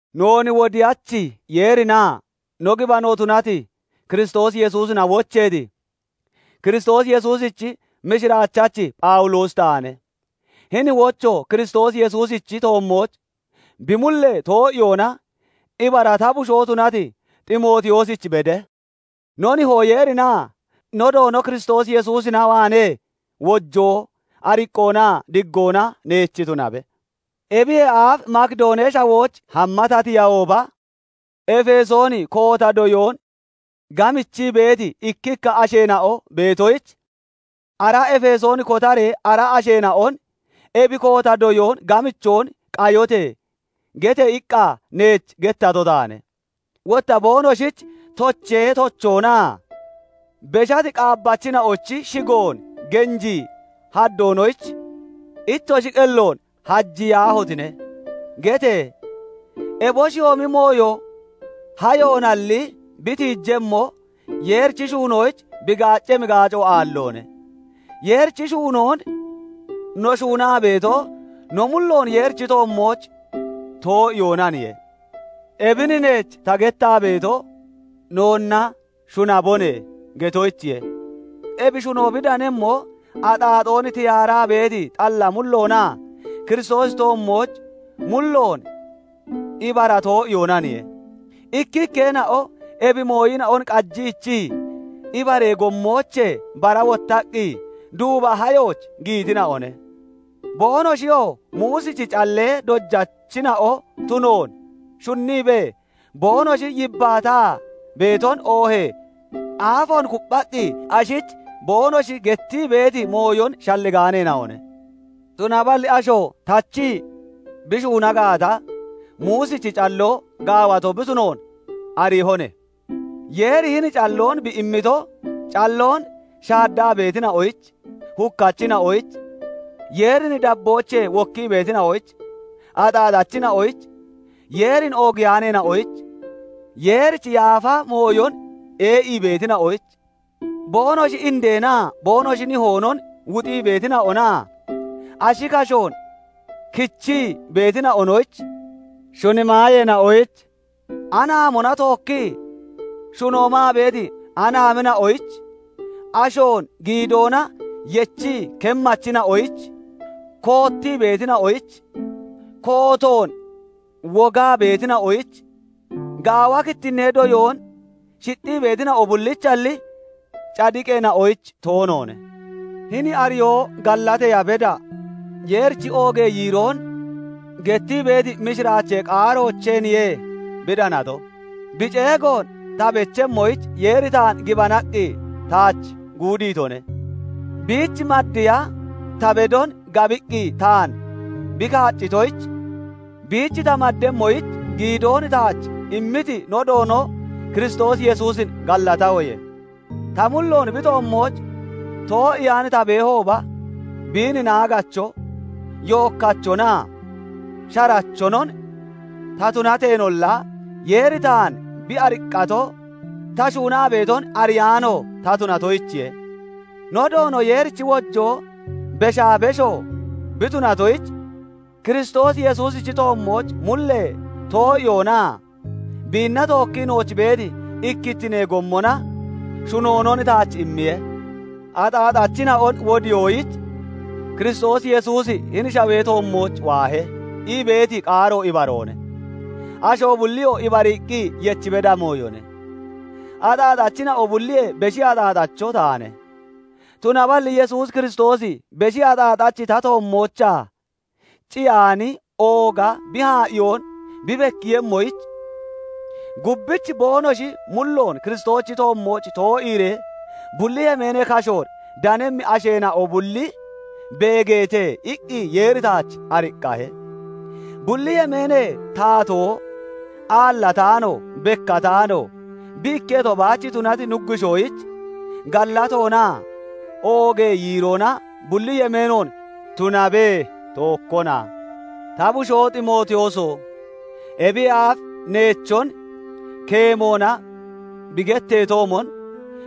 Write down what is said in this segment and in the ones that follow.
Noon Wodiyachi Yeerinaa no gibano tunati Kiristoos Yesuusina wocheeti, Kiristoos Yesuusichi mishiraachachi Phawuloosi taane; hini wocho Kiristoos Yesuusichi toommooch bi mullee too'iyoona ibara ta bushoo tunati Ximootiyoosich bede; no Nihoo Yeerinaa no Doono Kiristoos Yesuusina waanee wojoo, ariqqoonaa diggoona neech tunabe. Ebiyee aaf Makidoonee Shawooch hamma ta tiyahooba, Efesoon koota doyoon gamichii beeti ikkikka asheena'o beetoyich, "Ara Efesoon kotaree ara asheena'on 'Ebi koota doyoon gamichoon qayote!' gete!" iqqa neech gettato taane. Wotta boonoshich "Tochee tochoonaa beshati qaabbachina'ochi shigoon genjii haddoonoyich ittoshi qelloon hajiyaahotine!" gete! Eboshiyoomi mooyo hayoonalli (naboonalli) bi tiijemmo, Yeerichi shuunoyich bi gaaccemmi gaaco aalloone; Yeerichi shuunoon no shuunaa beeto, no mulloon Yeerichi toommooch too'iyoonaniye. Ebin neech ta gettaa beeto, "Noonnaa noonna shunabone" getoyichiye. Ebi shuno bi danemmo axaaxoon tiyaaraa beeti xalla mulloonaa Kiristoosichi toommooch mulloon ibara too'iyoonaniye. Ikkikkeena'o ebi mooyina'on qajiichii ibaree gommoochee bara wottaqqi duuba hayooch (nabooch) giyitina'one. Boonoshiyoo Muusichi callee dojachina'o tunoon shunniibee, boonoshi yibbaataa beeton oohee aafoon kupphaqqi ashich boonoshi gettii beeti mooyon shalligaaneena'one. Tunaballi asho tachii bi shuuna gaata, Muusichi calloo gaawato bi tunoon ariihone; Yeeri hini calloon bi immito, calloon shaaddaa beetina'oyich, hukkachina'oyich, Yeerin dabboochee wokkii beetina'oyich, axaaxachina'oyich, Yeerin oogiyaaneena'oyich, Yeerichi yaafa mooyon ee'ii beetina'oyich, boonoshi indeenaa boonoshi nihoonon wuxii beetina'onaa ashi kashoon kichii beetina'onoyich, shuni maayeena'oyich, anaamona tookkii shuno maa beeti anaamina'oyich, ashoon giidoona yechii kemmachina'oyich, koottii beetina'oyich, kootoon wogaa beetina'oyich, gaawa kittinnittinee doyoon shixxii beetina'o bullichalli, cadiqeena'oyich toonoone. Hini ariyoo gallateeya beda, Yeerichi oogee yiiroon gettii beeti mishiraachee qaaroocheeniye bi danato; bi ceegoon ta bechemmoyich Yeeri taan gibanaqqi taach guudiitone. Biich maddiya ta bedon gabiqqi taan bi kaaccitoyich, biich ta maddemmoyich giidoon taach immiti no Doono Kiristoos Yesuusin gallatahoye. Ta mulloon bi toommooch too'iyaan ta beehooba, biin naaggacho, yookkachonaa sharachonon ta tunateenolla, Yeeri taan bi ariqqato ta shuunaa beeton ariyaano ta tunatoyichiye. No Doono Yeerichi wojoo beshaa besho bi tunatoyich, Kiristoos Yesuusichi toommooch mullee too'iyoonaa biinna tookkii nooch beeti ikkittinee gommona shunoonon taach immiye. "Axaaxachina'on wodiyoyich Kiristoos Yesuusi hini shawee toommooch waahe" ii beeti qaaro ibaroone; asho bulliyoo ibariiqqi yech beda mooyone. Axaaxachina'o bulliyee beshi axaaxacho taane; tunaballi Yesuus Kiristoosi beshi axaaxachi ta toommoochaa ciyaani ooga bi haa'iyoon bi bekkiiyemmoyich, "Gubbich boonoshi mulloon Kiristoosichi toommooch too'iiree bulli yemeenee kashoon danemmi asheena'o bulli beegeete" iqqi Yeeri taach ariqqahe. Bulli Yemeenee Taatoo, aallataano, bekkataano, bi ikketo baach tunati Nuggushoyich gallatoonaa oogee yiiroona bulli yemeenoon tunabe! Tookkona. Ta bushoo Ximootiyooso! Ebiyee aaf neechon keemoona bi getteetoomon,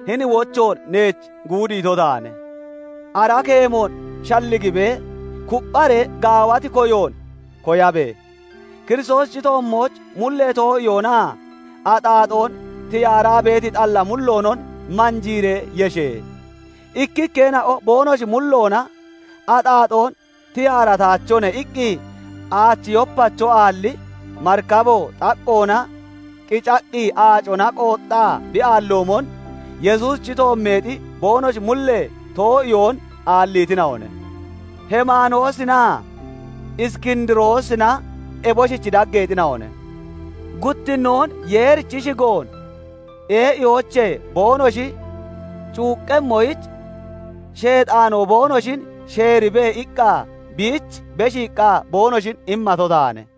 hini wochoon neech guudiito taane. Ara keemoon shalligibee, kuppharee gaawati koyoon koyabe! Kiristoosichi toommooch mullee too'iyoonaa axaaxoon tiyaaraa beeti xalla mulloonon manjiiree yeshe! Ikkikkeena'o boonoshi mulloona "Axaaxoon tiyaarataachone" iqqi, aachi yopacho aalli marikabo xaqqoona qiccaqqi aacona qooxxaa bi aalloomon, Yesuusichi toommeexi boonoshi mullee too'iyoon aalliitina'one. Heemanoosinaa Iskindiroosina eboshichi daggeexina'one; guttinnoon Yeerichi shigoon ee'iyoochee boonoshi cuuqqemmoyich, "Sheexaanoo boonoshin sheeribe" iqqa biich beshiiqqa boonoshin immato taane.